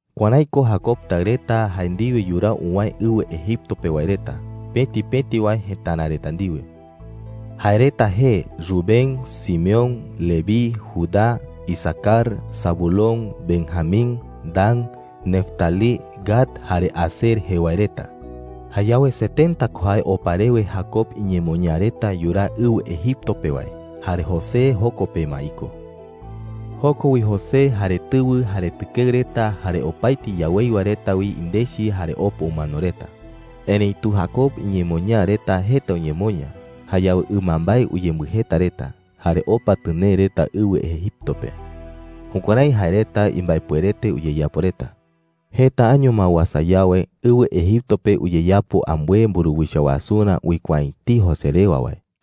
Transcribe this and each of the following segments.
Kuärái ko Jacob taɨ reta jae ndiwe yuraa uwäe ɨwɨ Egipto pe wae reta, pëti pëti wae jëtara reta ndiwe. Jae reta jee Rubén, Simeón, Leví, Judá, Isacar, Zabulón, Benjamín, Dan, Neftalí, Gad jare Aser jee wae reta. Jayawe setenta ko jae opa rewe Jacob iñemoñaa reta yuraa ɨwɨ Egipto pe wae. Jare José joko pe ma iko. Joko wi José, jare tɨwɨ, jare tɨkeɨ reta, jare opaete iyaweiwa reta wi indechi jare opa umano reta. Erëitu Jacob iñemoñaa reta jeta uñemoña. Jayawe ɨmambae uyembɨjeta reta, jare opa tɨnee reta ɨwɨ Egipto pe. Jukuärái jae reta imbaepuerete uyeyapo reta. Jeta año ma uasa yawe, ɨwɨ Egipto pe uyeyapo ambɨe mburuwicha wasurä uikuaa’ä etei José rewa wae.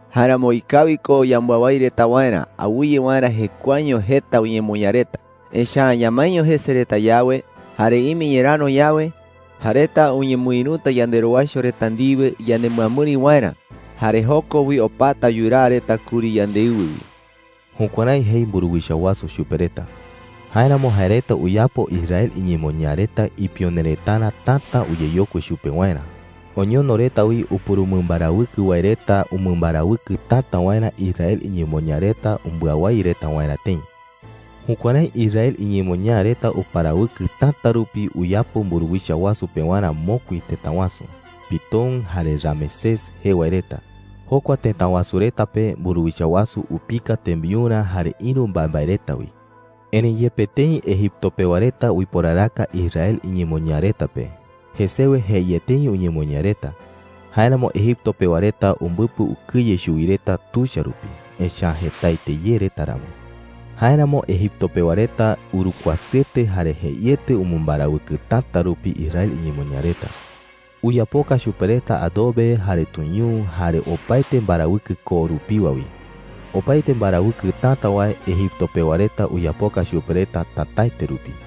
“Jáeramo ikawi ko yambɨawái reta waerä awɨye waerä jekuaeño jeta uñemoña reta. Echa’ä ñamaeño jese reta yawe, jare ime ñeräro yawe, jae reta uñemɨïruta yanderowaicho reta ndiwe ñanemɨamɨri waerä. Jare joko wi opata yuraa reta kuri yandeɨwɨ wi.” Jukuärái jei mburuwicha wasu chupe reta. Jáeramo jae reta uyapo Israel iñemoñaa reta ipione retarä täta uyeyokui chupe waerä. Oñono reta wi upurumɨmbarawɨkɨ wae reta umɨmbarawɨkɨ täta waerä Israel iñemoñaa reta umbɨawái reta waerä tëi. Jukuärái Israel iñemoñaa reta uparawɨkɨ täta rupi uyapo mburuwicha wasu pewarä mokui tëta wasu, Pitón jare Ramesés jee wae reta. Jokua tëta wasu reta pe mburuwicha wasu upika tembiurä jare ïru mbaembae reta wi. Erëi yepe tëi Egipto pewa reta uiporaraka Israel iñemoñaa reta pe, jesewe jeieteño uñemoña reta. Jáeramo Egipto pewa reta umbɨpɨ ukɨye chuwi reta tuicha rupi, echa’ä jetaete ye reta ramo. Jáeramo Egipto pewa reta urukuasɨete jare jeiete umɨmbarawɨkɨ täta rupi Israel iñemoñaa reta. Uyapoka chupe reta adobe jare tuñuu, jare opaete mbarawɨkɨ koo rupiwa wi. Opaete mbarawɨkɨ täta wae Egipto pewa reta uyapoka chupe reta tätaete rupi.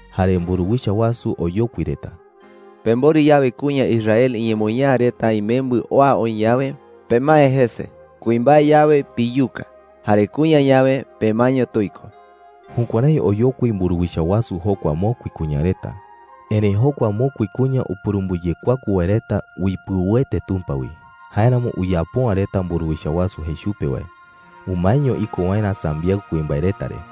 Jare mburuwicha wasu oyokui reta: “Pemborɨ yawe kuña Israel iñemoñaa reta imembɨ oa oï yawe, pemae jese. Kuimbae yawe, piyuka. Jare kuña yawe, pemaeño tuiko.” Jukuärái oyokui mburuwicha wasu jokua mokui kuña reta. Erëi jokua mokui kuña upurumbɨyekuaku wae reta uipɨuete Tumpa wi. Jáeramo uyapo’ä reta mburuwicha wasu jei chupe wae. Umaeño iko waerä sambiaɨ kuimbae reta re.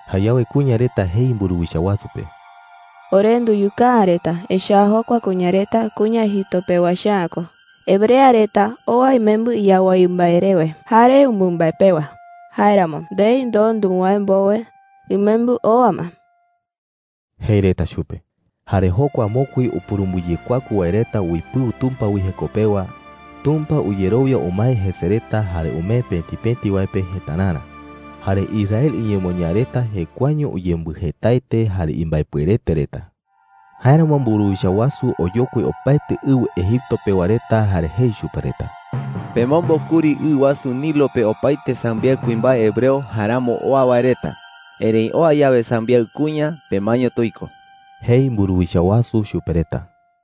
Jayawe kuña reta jei mburuwicha wasu pe: “Ore nduyuka’ä reta, echa’ä jokua kuña reta kuña Egipto pewa echa’ä ko. Hebrea reta oa imembɨ yawái mbae rewe jare ɨmambae pewa. Jáeramo ndei ndoo nuwäe mbowe imembɨ oa ma,” jei reta chupe. Jare jokua mokui upurumbɨyekuaku wae reta uipɨu Tumpa wi jeko pewa, Tumpa uyerowia umae jese reta jare umee pëti pëti wae pe jetärarä. Jare Israel iñemoñaa reta jekuaeño uyembɨjetaete jare imbaepuerete reta. Jáeramo mburuwicha wasu oyokui opaete ɨwɨ Egipto pewa reta jare jei chupe reta: “Pemombo kuri ɨ wasu Nilo pe opaete sambiaɨ kuimbae hebreo jaeramo oa wae reta. Erëi oa yawe sambiaɨ kuña, pemaeño tuiko,” jei mburuwicha wasu chupe reta.